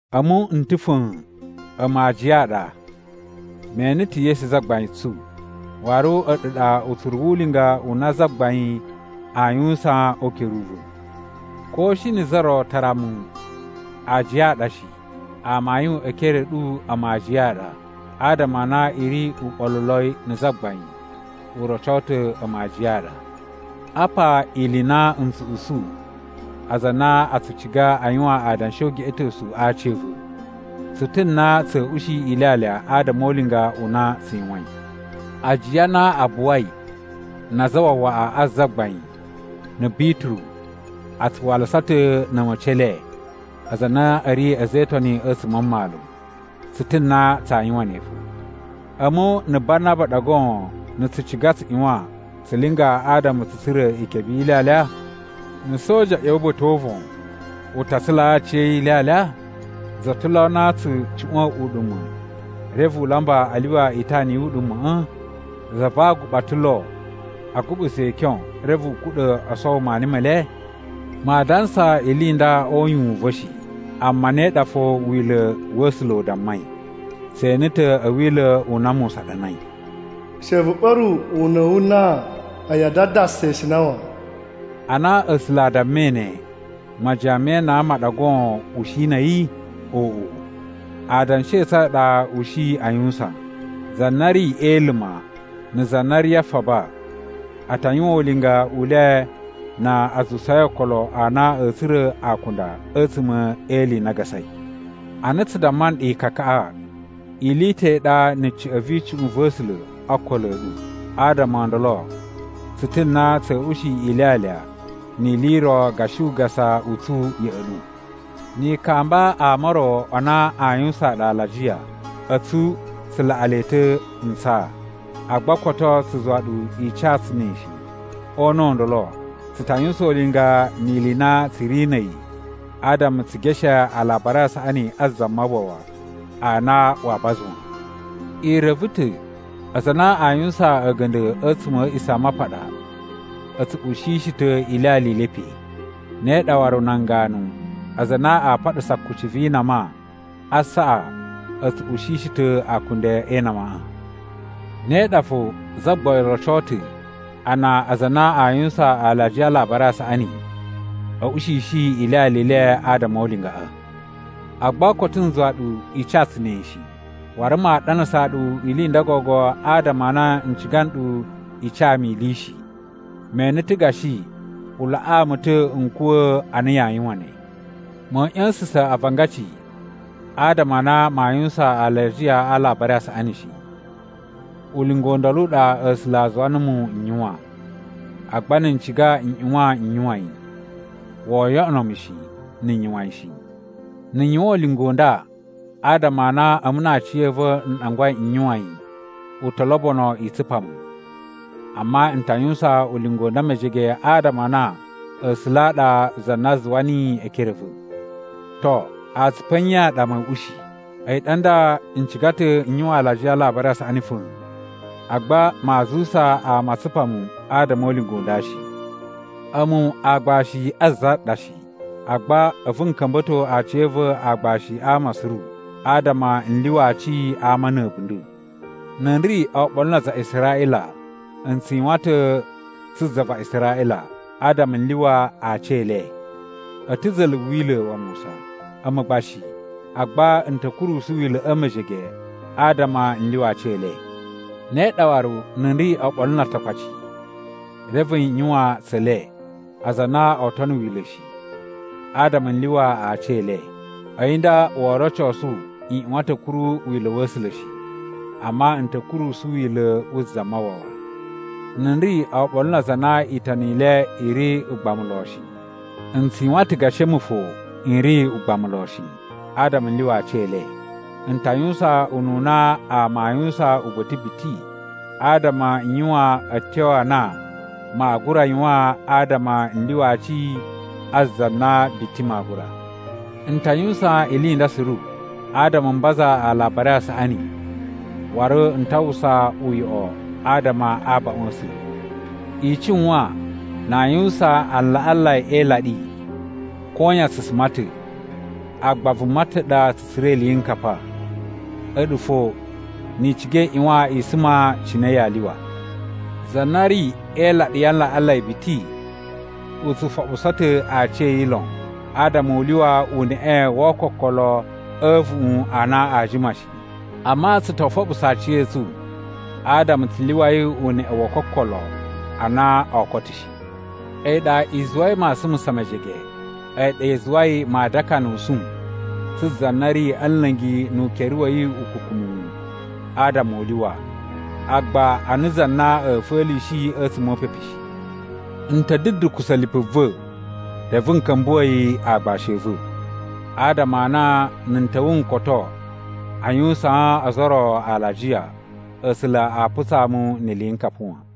A̱mu n ta̱ fa̱a̱n. A̱mu aajiya a ɗa. Me ene ta̱ Yesu Zagbain tsu, waru a̱ɗu ɗa utsuru wu ulinga u na Zagbain aa yuwusan o ukere u va̱. Ko shi na̱ za ro tara a̱mu aajiya a ɗa shi, amayun e ekere a̱ ɗu a̱mu aajiya a ɗa. Adama a na i ri uɓoluloi na̱ Zagbain u roco ta̱ a̱mu a aajiya a ɗa. Apa ili i na n tsu usu aza a na a tsu ciga a yuwan adanshi o ugeꞌetosu a aci a̱ va̱: Tsu ta̱ na tsa̱a̱ ushi ilyalya adama o ulinga u na tsu yuwain. Ajiya a na a buwai na azawawaꞌa a Zagbain, na̱ Bituru a tsu walasa ta̱ na̱ a̱ma̱ci e le aza a na a̱ ri a̱za̱ e Itoni a̱tsuma̱ a mmalu. Tsu ta̱ na tsaa yuwan ne fo. A̱mu na̱ Banaba ɗa goon na̱ tsu ciga tsu ꞌyuwan tsu linga adama tsu tsura̱ ikebe yi ilyalya? Na̱ soja ꞌya̱wa̱ ba̱ta̱ o uvon, u ta tsulaa aciya̱yi ilyalya? Za ta̱ lo na tsu cuꞌwa̱n uɗuma̱ reve u lamba a lyuwa itana yu uɗuma̱ꞌa̱? Za va aguɓa ta̱ lo a guɓusa ikyon reve u kuɗa̱ o sowo maani me le? Maa dansa ili i nda o uyuwun u va̱ shi, amma ne ɗa fo Wila̱ wa̱ A̱sula̱ u dammai. Tse ene ta̱ a̱ Wila̱ u na Musa ɗanai: “She vu ɓa̱ru una̱ wu nan a̱yi a dadasa ishina wan.” Ana A̱sula̱ a dammai ne, majiyan me inan ma ɗa goon u shi na̱ a̱yi? Oꞌo! Adanshi a̱ tsu a ɗa u shi a yuwusan. Za na ri e iluma na̱ za na ri a faba a ta yuwan ulinga u le na a zuwusai okolo a na a̱a̱ tsura̱ akunda a̱tsuma̱ e ili i na a gasai. Ana tsu damma nɗu ikakaꞌa ili i ta̱ i ɗa na̱ ca̱ꞌa̱n vi icuꞌun va̱ A̱sula̱ o okolo a̱ ɗu. Adama o ndolo tsu ta̱ na tsa̱a̱ ushi ilyalya ni ili i ro gashi ugasa u tsu ya̱ꞌa̱ ɗu. Ni i kamba ama o ro a na a yuwusaan nɗu alajiya, a̱tsu tsu laꞌa le ta̱ ntsaa. Agba koto tsu zuwa ɗu i ca tsu ne shi. O una̱ u ndolo, tsu ta yuwusan ulinga ni ili i na tsu ri na̱ a̱yi adama tsu geshe Alabari a Saꞌani a Zamawawa a na waa baza wan. I reve ta̱ aza a na aa yuwusan a̱ga̱nda̱ a̱tsuma̱ a̱ A̱a̱ꞌisamapaɗa a̱ tsu ushishi ta̱ ilyalya i le pe. Ne ɗa waru nan ganu aza a na aa paɗasa kucci vi inama a asaꞌa a̱ tsu ushishi ta̱ akunda e inamaꞌa. Ne ɗa fo Zagbain roco ta̱ a na aza a na aa yuwusan alajiya a Alabari a Saꞌani a̱ ushishi ilyalya i le adama o ulingaꞌa. Agba koto n zuwa ɗu i ca tsu ne shi. Waru maa ɗanasaa ɗu ili i nda gogo adama a na n ciga nɗu i ca mu ili shi. Me ene ta̱ gashi u laꞌaa mu ta̱ n kuwa̱ a na yaa yuwan ne. Ma̱a̱ ꞌya̱sa̱sa̱n avangaci adama a na maa yuwusan alajiya a Alabari a Saꞌani shi. Ulinga u ndolo u ɗa A̱sula̱ a zuwa numu n yuwan, agba na̱ n ciga n ꞌyuwan n yuwan yi. Woo yoꞌono mu shi na̱ n yuwan yi shi! Na̱ n yuwan ulinga u nda adama a na a̱mu na aciya̱va̱ n ɗangwai n yuwan yi, u to lobono i tsupa mu. Amma n ta yuwusan ulinga u nda mejege adama a na A̱sula̱ a ɗa za na zuwa niyi e ekere a̱ va̱. To, atsupu a̱ nye a ɗa ma̱a̱ ushi? A̱yi ɗa nda n ciga ta̱ n yuwan alajiya a Alabari a Saꞌani fa̱a̱n, agba maa zuwusa ama a tsupa mu adama o ulinga u nda shi. A̱mu aagbashi a za ɗa shi, agba a̱vu n ka̱mba̱to aciya̱va̱ aagbashi a ama suru adama n lyuwa aci a ama na̱ a̱bunda̱. Na̱ n ri oɓolo na aza a Israꞌila, n tsu yuwan ta̱ tsu za va Israꞌila adama n lyuwa aci e le. A̱ ta̱ za̱la̱ Wila̱ wa Musa, a̱mu gba shi. Agba n ta̱ kurusu Wila̱ꞌa̱ mejege adama n lyuwa aci e le. Ne ɗa waru, na̱ n ri oɓolo na Atakpaci, reve n yuwan tse le, aza a na oo tono Wila̱ shi, adama n lyuwa aci e le. A̱yi nda woo rocosu n ꞌyuwan ta̱ a̱ kuru wila̱ wa̱ A̱sula̱ shi, amma n ta̱ kurusu wila̱ wu Zamawawa. Na̱ n ri oɓolo na aza a na Itoni i le i ri ugbamu lon shi, n tsu yuwan ta̱ gashi a̱mu fo n ri ugbamu lon shi, adama n lyuwa aci e le. N ta yuwusan ununa ama aa yuwusan uba̱ta̱ biti adama n yuwan a̱tyo a na maa gura yuwan adama n lyuwa aci a za na biti maa gura. N ta yuwusan ili i nda suru adama m baza Alabari a Saꞌani, waru n ta uwwusa uyoꞌo adama a abaꞌun a̱ A̱sula̱. I cuwan na a yuwusan alaꞌanlai e ilaɗi, koyan tsu suma ta̱, agba vuma ta̱ ɗa tsu tsura̱ iliyinkapa. A̱ɗu fo ni i ciga i ꞌyuwan i suma cine yaa lyuwa. Za na ri e ilaɗi ya alaꞌanlai biti u tsu foɓuso ta̱ aciya̱yi lon adama u lyuwa uneꞌe wo ookokolo a̱ a̱vuꞌun a na aa jima shi. Amma tsu to foɓuso aciya̱tsu adama tsu lyuwai uneꞌe wo okokolo a na oo koto shi. A̱yi ɗa i zuwai ma sumusa mejege. A̱yi ɗa i zuwai maa dakanusu tsu za na ri a̱ nla̱ngi nu ukere wa̱ yi ukukumuwu adama u lyuwa, agba ana za na a̱ fa̱lishi a̱tsuma̱ o upepu shi. N ta̱ dudukusa̱ lipu va̱ reve n ka̱mbuwa̱ yi aagbashi a̱ va̱ adama a na na̱ n ta̱wa̱ n koto a yuwusaan ozo o ro alajiya, A̱sula̱ a putsaa mu ni iliyinkapa wan.